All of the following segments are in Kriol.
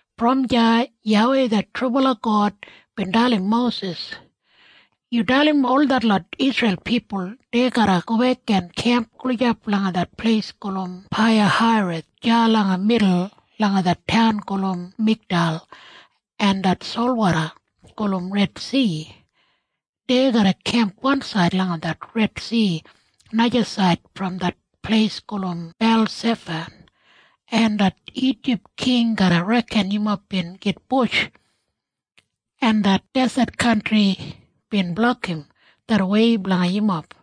Brom deya YAWEI det trubala God bin dalim Mosis, “Yu dalim ol detlot Isreil pipul dei garra gobek en kemp gulijap langa det pleis gulum Paiyahairoth deya langa midul langa det taun gulum Migdal en det solwoda gulum Redsi. Dei garra kemp wansaid langa det Redsi najasaid brom det pleis gulum Beilsefan, en det Ijip king garra reken yumob bin gitbush, en det deset kantri bin blokim det wei blanga yumob.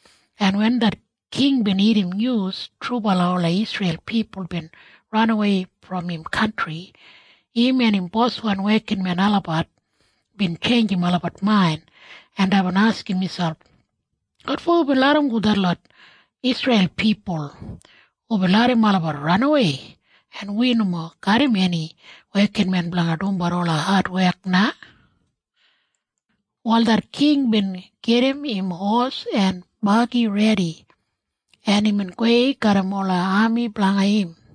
en wen det king bin irrim nyus trubala ola Isreil pipul bin ranawei brom im kantri, im en im boswan wekinmen olabat bin tjeinjim olabat main, en deibin askim miselp, “Wotfo wibin larramgo detlot Isreil pipul? Wibin larram olabat ranawei, en wi nomo garram eni wekinmen blanga dumbat ola adwek na!” Wal det king bin gedim im hos en bagi redi, en imbin gowei garram ola ami blanga im.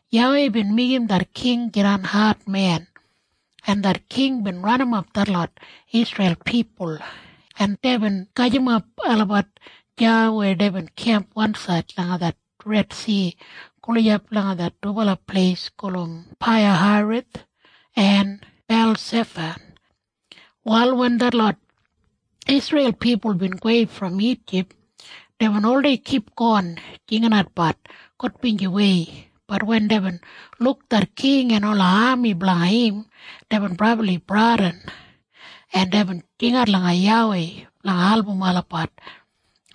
YAWEI bin meigim det king jidan admen, en det king bin ranimap detlot Isreil pipul, en deibin gajimap olabat deya weya deibin kemp wansaid langa det Redsi gulijap langa det dubala pleis gulum Paiyahairoth en Beilsefan. Wal wen detlot Isreil pipul bin gowei brom Ijip, deibin oldei kipgon jinginatbat gudbinjiwei. Bat wen deibin luk det king en ola ami blanga im, deibin brabli bradin, en deibin jingat langa YAWEI blanga album olabat,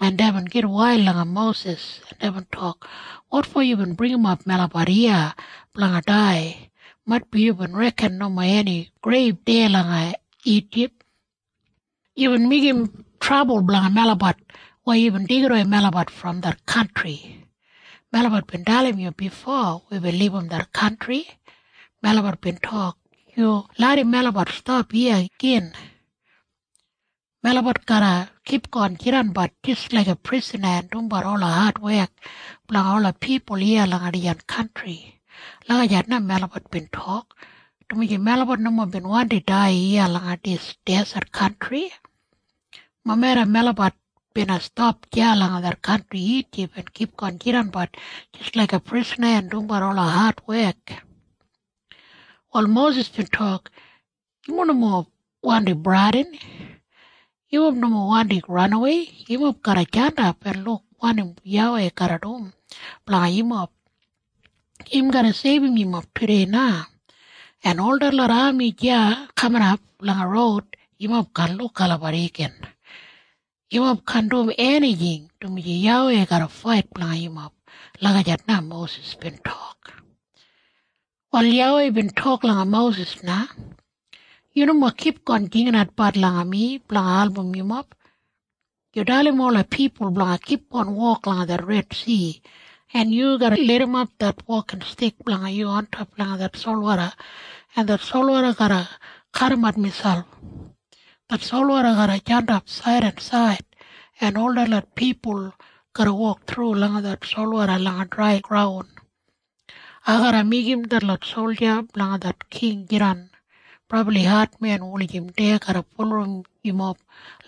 en deibin gitwail langa Mosis, en deibin tok, “Wotfo yubin bringimap melabat iya blanga dai? Maitbi yubin reken nomo eni greib deya langa Ijip! Yubin meigim trabul blanga melabat weya yubin deigidawei melabat brom det kantri! Melabat bin dalim yu bifo wibin libum det kantri. Melabat bin tok, ‘Yu larram melabat stap iya gin. Melabat garra kipgon jidanbat jis laiga prisana en dumbat ola adwek blanga ola pipul iya langa dijan kantri.’ Lagijat na melabat bin tok, dumaji melabat nomo bin wandi dai iya langa dis deset kantri. Mobeda melabat bina stap deya langa det kantri Ijip en kipgon jidanbat jis laiga prisana en dumbat ola adwek.” Wal Mosis bin tok, “Yumob nomo wandi bradin! Yumob nomo wandi ranawei! Yumob garra jandap en luk wanim YAWEI garra dum blanga yumob. Im garra seibum yumob tudei na, en ol detlot ami deya kaminap langa roud, yumob kaan luk olabat igin. Yumob kaan dum enijing, dumaji YAWEI garra fait blanga yumob.” Lagijat na Mosis bin tok. Wal YAWEI bin tok langa Mosis na, “Yu nomo kipgon jinginatbat langa mi blanga album yumob. Yu dalim ola pipul blanga kipgon wok langa det Redsi, en yu garra lidimap det wokinstik blanga yu ontop langa det solwoda, en det solwoda garra kadimat miselp. Det solwoda garra jandap said en said, en ol detlot pipul garra wok thru langa det solwoda langa drai graun. Ai garra meigim detlot solja blanga det king jidan brabli admen wulijim dei garra bulurrum yumob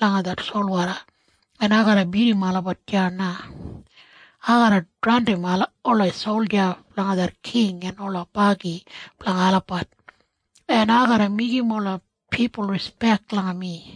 langa det solwoda, en ai garra bidim olabat deya na. Ai garra draundim ola solja blanga det king en ola bagi blanga olabat, en ai garra meigim ola pipul rispek langa mi,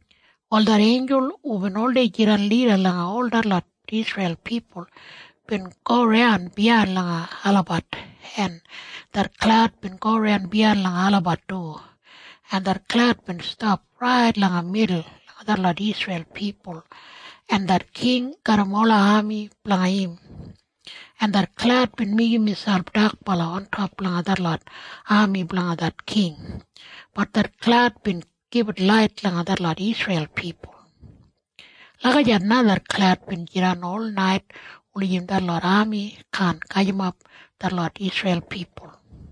Wal det einjul hubin oldei jidan lida langa ol detlot Isreil pipul bin goran biyain langa olabat, en det klaud bin goran biyain langa olabat du, en det klaud bin stap rait langa midul langa detlot Isreil pipul en det king garram ola ami blanga im, en det klaud bin meigim miselp dakbala ontop langa detlot ami blanga det king. Bat det klaud bin gibit lait langa detlot Isreil pipul. Lagijat na det klaud bin jidan olnait wulijim detlot ami kaan gajimap detlot Isreil pipul.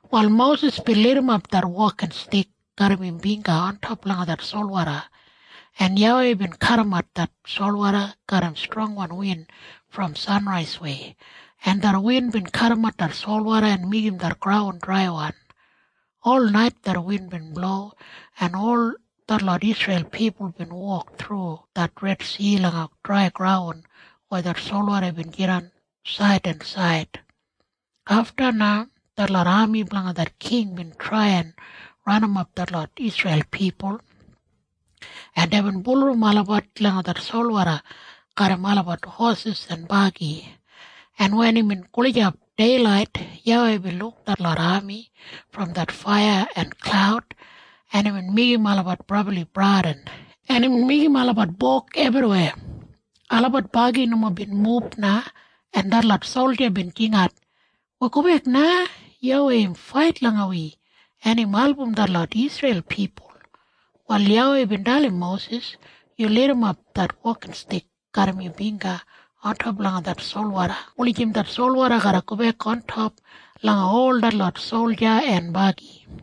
Wal Mosis bin lidimap det wokinstik garram im bingga ontop langa det solwoda, en YAWEI bin kadimat det solwoda garram strongwan win brom sanraiswei, en det win bin kadimat det solwoda en meigim det graun draiwan. Olnait det win bin blo, en ol detlot Isreil pipul bin wok thru det Redsi langa drai graun weya det solwoda bin jidan said en said. Afta na detlot ami blanga det king bin trai en ranimap detlot Isreil pipul, en deibin bulurrum olabat langa det solwoda garram olabat hosis en bagi, en wen imbin gulijap deilait, YAWEI bin luk detlot ami brom det faiya en klaud, en imbin meigim olabat brabli bradin, en imbin meigim olabat bog ebriweya. Olabat bagi nomo bin mub na, en detlot solja bin jingat, “Wi gobek na! YAWEI im fait langa wi, en im album detlot Isreil pipul!” Wal YAWEI bin dalim Mosis, “Yu lidimap det wokinstik garram yu bingga ontop langa det solwoda wulijim det solwoda garra gobek ontop langa ol detlot solja en bagi.”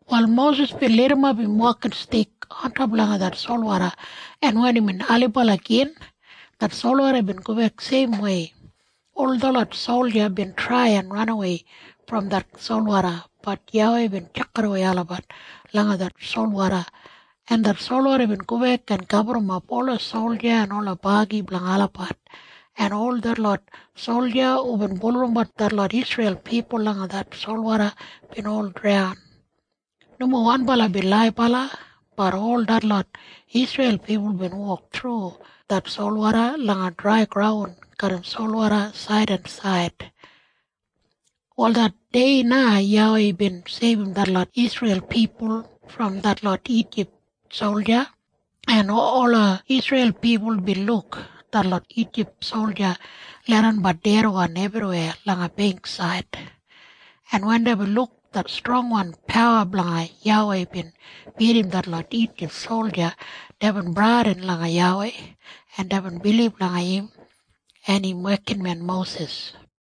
Wal Mosis bin lidimap im wokinstik ontop langa det solwoda, en wen imbin ailibala gin, det solwoda bin gobek seimwei. Ol detlot solja bin trai en ranawei brom det solwoda. Bat YAWEI bin tjakidawei olabat langa det solwoda, en det solwoda bin gobek en gaburrumap ola solja en ola bagi blanga olabat, en ol detlot solja hubin bulurrum detlot Isreil pipul langa det solwoda bin ol draun. Nomo wanbala bin laibala. Bat ol detlot Isreil pipul bin wok thru det solwoda langa drai graun garram solwoda said en said. Wal det dei na YAWEI bin seibum detlot Isreil pipul brom detlot Ijip solja, en ola Isreil pipul bin luk detlot Ijip solja leidanbat dedwan ebriweya langa beingksaid. En wen deibin luk det strongwan pawa blanga YAWEI bin bidim detlot Ijip solja, deibin bradin langa YAWEI, en deibin bilib langa im en im wekinmen Mosis.